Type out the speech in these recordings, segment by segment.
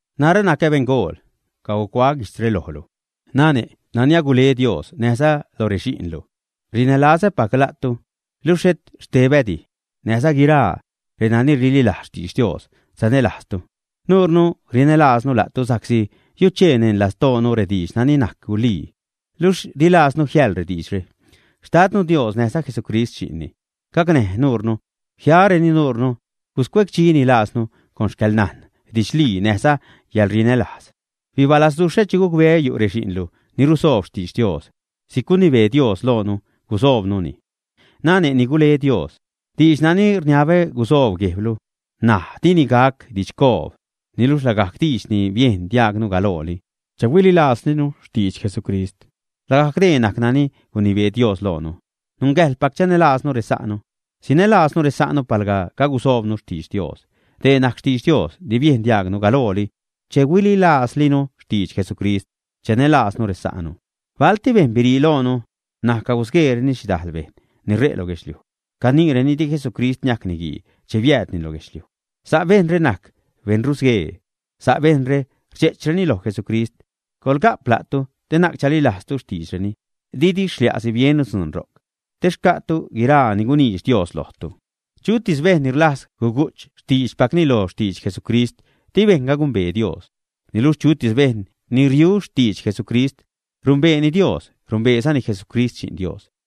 Narä nacä beṉgool. Cagucuaä guijtzre lojlu nane' nani agule Dios, näjza loj rexi'nlu. Rinälazäpac la'tu luxh xhet xtebädi; näjza guiraa reni rililajz xtidx Dios sanälajztu. Nuure rinälaaznu la'tu sa'csi yuchee neṉ lastoonu rediidx nani najc gulii, luxh dilajznu jiäḻ rediidxre. Xtadnu Dios, näjza Jesucrist Xi'nni, gacnäj nuunu, jiareni nuunu, guscuecdxi lajznu con xcäḻnajn didxlii näjza yälrinälajz. Bibalazduxhä che gucbeä yu' rexi'nlu ni rusoob xtidx Dios si'c gunibee Dios loonu gusoobnuni. Nane' ni gule Dios, diidx nani rniabä gusoob guejblu ṉaj dini gac didxcoob, niluxh lagajc diidx ni biejn diaagnu galooli, che huililaazlinu xtidx Jesucrist. Lagajc dee najc nani gunibee Dios loonu: nungäjḻpac chanälaaznu resa'nu. Sinälaaznu resa'nu palga cagusoobnu xtidx Dios. Dee najc xtidx Dios ni biejn diaagnu galooli, che huililaazlinu xtidx Jesucrist: chanälaaznu resa'nu. Balti bejṉ birii loonu, ṉaj cagusgueereni xhidajl bejṉ ni ṟe' lo guedxliuj. Caniireni di Jesucrist niajc niguii che biäädni lo guedxliuj. Sa' bejṉre najc beṉrusguee. Sa' bejṉre rdxe'chreni loj Jesucrist. Coḻga'p la'tu te na'c chalilajztu xtiidxreni, didi xlia'si biennu dzuun ro'c, te xca'tu guiraa ni guniidx Dios lojtu. Chutis bejṉ ni rlajz gugu'ch xtiidxpacni lo xtidx Jesucrist, di bejṉga gumbee Dios. Niluxh chutis bejṉ ni riu xtidx Jesucrist, rumbeeni Dios, rumbeezani Jesucrist Xi'n Dios.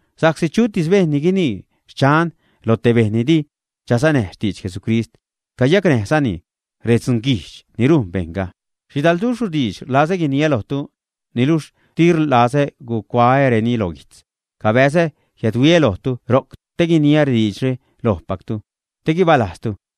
Sa'csi chutis bejṉ ni guinii “xchan” loj te bejṉ ni di chasanäj xtidx Jesucrist, cayacnäjzani redzunguijdx ni rujn bejṉga. Xhidalduxhru diidx rlazä guiniä lojtu, niluxh di rlazä gucuaäreni lo guijtz. Cabäzä jiädhuiä lojtu ro'c te guiniä rediidxre lojpactu, te guibaalajztu.